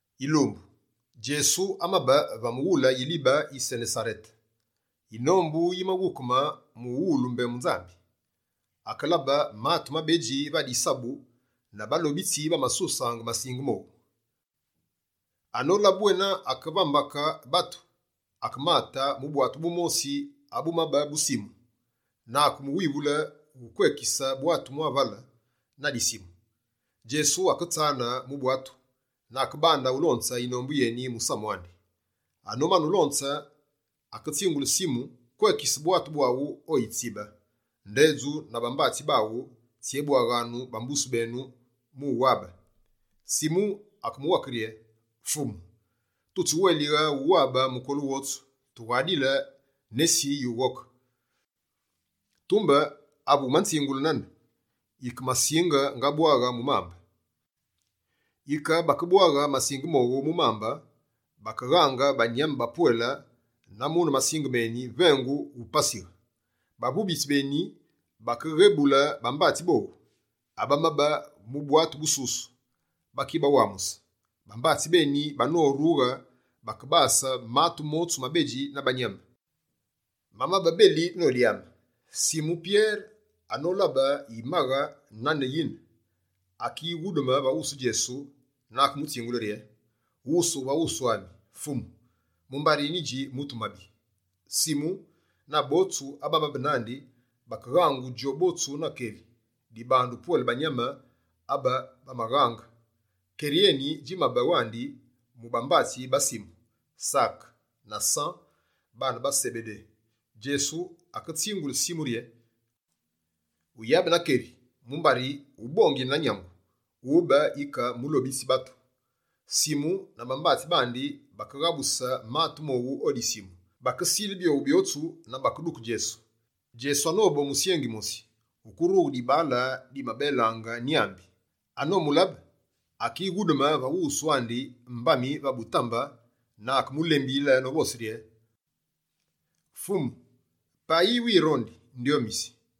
Yilumbu, Djesu amabe va mughule yilibe yi Senesarete. Yinombu yimaghukume mu uwulu mbembu Nzambi. Akelabe matu mabedji va disabu na balobitsi bamasusaange masinge mowu. Anolabe bwena ake va mbake batu, akemate mu bwatu bumosi, abumabe bu Simu, na akemuwivule mu kwekise bwatu mwa vale na disimu. Djesu aketsane mu bwatu na akebande ulonze yinombu yeni musamu andi. Anomane ulonze, aketsingule Simu: «Kwekise bwatu bwaghu o yitsibe, ndedju na bambatsi baghu, tsyébwaghyanu bambuse benu mu uwabe.» Simu akemuwake rye: «Fumu, tutsiwélighe wuwabe mukolu wotsu, tughadile nesi yughoke. Tumbe ave wumanzingule nane, yike masinge ngabwaghe mu mambe.» Yike, bakebwaghe masinge mowu mu mambe, bakeghaange banyame bapwele na mune masinge meni, vengu wupasighe. Bavubitsi beni, bakeghebule bambatsi bowu, abamabe mu bwatu bususu bakibawamuse. Bambatsi beni, banorughe, bakebase matu motsu mabedji na bayame, mamabe beli nodyame. Simu Pyere anolabe yimaghe nane yine, akighudume va wusu Djesu na akemutsingule rye: «Wusughe va wusu ami, Fumu, mumbari nyidji mutu mabi!» Simu, na botsu abamabe nandi, bakeghangu djobotsu na keri, dibandu pwele banyame abe bamaghaange. Keri eni, djimabe wandi mu bambatsi ba Simu, Sake na San, baane ba Sebede. Djesu aketsingule Simu rye: «Uyabe na keri mumbari ubongile na nyangu, wube yike mulobitsi batu.» Simu na bambatsi bandi bakeghabuse matu mowu o disimu, bakesile byowu byotsu na bakeduke Djesu. Djesu anobe o musyengi mosi, wukurughe dibaale dimabelaange nyámbi. Anomulabe, akighudume va wusu andi, mbami va butambe na akemulembiyile novose rye: «Fumu payi wirondi, ndyomisi.»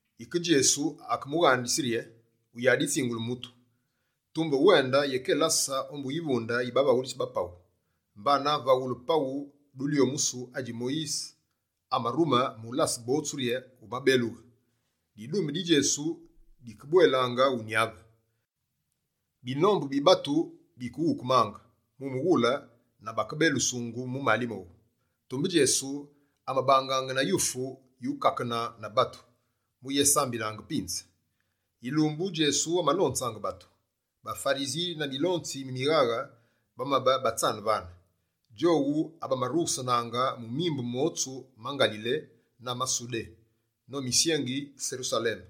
Yike, Djesu akemughandise rye: «Wuyaditsingule mutu. Tumbe wende yékelase ombu yivunde yi bavaghulitsi ba paghu, mbana vaghule paghu dulyomusu adji Moyise amarume mu ulase botsu rye wumabelughe.» Didume di Djesu dike bwelaange wunyave. Binombu bi batu bike wukemaange na bakebelusungu mu mali mowu. Tumbe Djesu, amabangaange na yufu yukakenaange na batu, mu uyésambilaange pinze. Yilumbu Djesu amalonzaange batu. BaFarisi na milonzi mi mighaghe bamabe batsane vane. Djowu abamarughusenaange mu mimbu motsu ma Ngalile na ma Sudé no musyengi Serusaleme.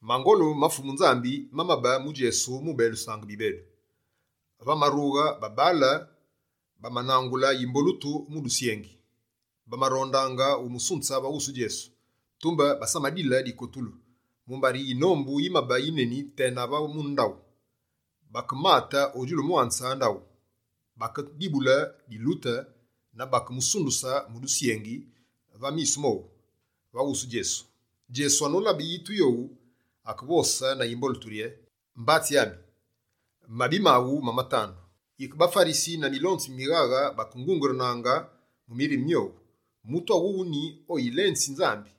Mangolu ma Fumu Nzambi mamabe mu Djesu mu ubelusaange bibedu. Va marughe babaale, banangule yimbolutu mu dusyengi, bamarondaange umusunze va wusu Djesu. Tumbe basamadile dikotulu, mumbari yinombu yimabe yineni tena va mune ndaghu. Bakemate o djulu mwanze ndaghu, bakedibule dilute na bakemusunduse mu dusyengi va misu mowu, va wusu Djesu. Djesu anolabe yitu yowu, akevose na yimbolutu rye: «Mbatsi ami, mabi maghu mamatandu.» Yike baFarisi na milonzi mi mighaghe bakengungurunaange mu mirime myowu: «Mutu awuwu ni oyilenzi Nzambi,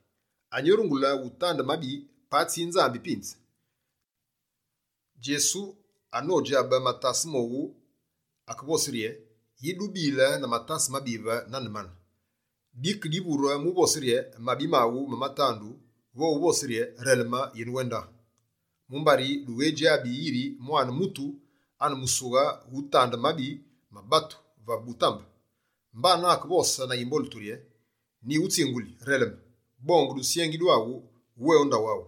anyi orungule utande mabi, patsi Nzambi pinze?» Djesu anodjabe matase mowu, akevose rye: «Yi dubile na matase mabive nane mane? Dike divure mu uvose rye: “Mabi maghu mamatandu” vo uvose rye: “Releme yenewende”? Mumbari dukedjabe yiri Mwane Mutu ane musughe utande mabi ma batu vave butambe.» Mbana akevose na yimbolutu rye: «Nyighutsinguli, releme, bonge dusyengi dwaghu we o ndaghu aghu.»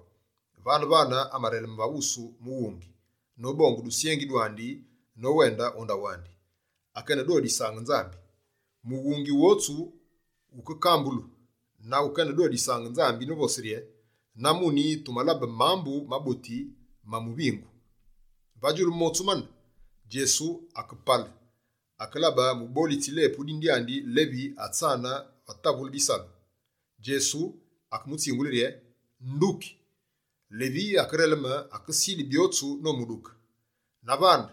Vane-vane amareleme va wusu mughungi, nobonge dusyengi dwandi nowende o ndaghu andi, akenedodisaange Nzambi. Mughungi wotsu wuke kambulu, na wukenedodisaange Nzambi novose rye: «Na muni tumalabe mambu maboti ma muvingu!» Va djulu motsu mane, Djesu akepale, akelabe mubolitsi lepu dine dyandi Levi atsane va tavule bisalu. Djesu akemutsingule rye: «Nduki!» Levi akereleme, akesile byotsu nomuduke. Na vane,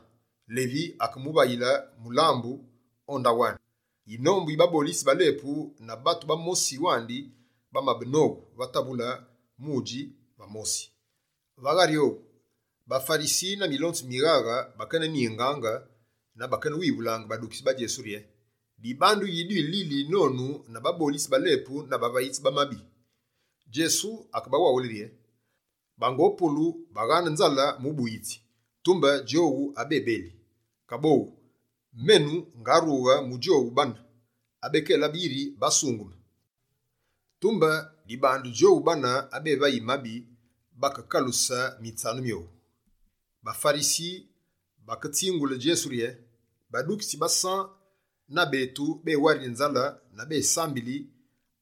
Levi akemuvayile mulambu o ndaghu andi. Yinombu yi babolitsi ba lepu na batu bamosi wandi bamabe nowu va tavule mu udji va mosi. Va ghari owu, baFarisi na milonzi mi mighaghe bakeneningaange na bakewivule badukitsi ba Djesu rye: «Dibandu yi dwilili nonu na babolitsi ba lepu na bavayitsi ba mabi?» Djesu akebawaghule rye: «Bango polu, baghaane nzale mubuyitsi, tumbe djowu abebeli. Kaboghu, menu, ngarughe mu djowu bana abekelabe yiri basungeme, tumbe dibandu djowu bana abevayi mabi bakekaluse mitsanu myowu.» BaFarisi baketsingule Djesu rye: «Badukitsi ba San na betu, bewarili nzale na besambili;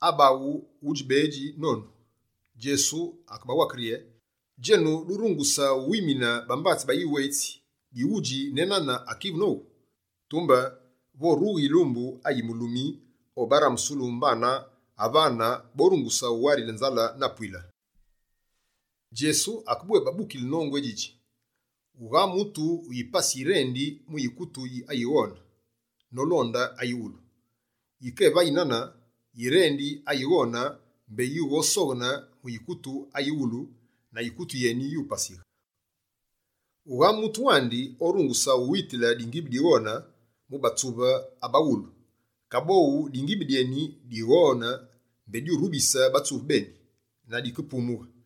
abaghu, udjibédji nonu.» Djesu akebawake rye: «Djenu, durunguse wuwimine bambatsi ba yiwetsi bighudji ne nane akivu nowu? Tumbe vorughe yilumbu ayi mulumi obarambusulu; mbana avane, borunguse wuwarile nzale na pwile.» Djesu akebwébabukile nongu eni djidji: «Wughaa mutu wipasi yirendi mu yikutu ayighone nolonde ayiwulu. Yike evayi nane, yirendi ayighone mbé yighosoghene mu yikutu ayighulu na yikutu yeni yupasighe. Wughaa mutu wandi orunguse uwitile malamu maghone mu batsuve aba ghulu. Kaboghu, malamu meni maghone mbé morubise batsuve, na makepumughe.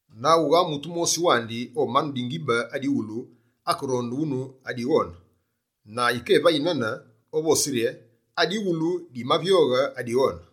Na wughaa mutu mosi wandi omanu malamu amaghulu akeronde wunu amaghone, na yikevayi nane, ovose rye: “Amaghulu mamavyoghe amaghone.”»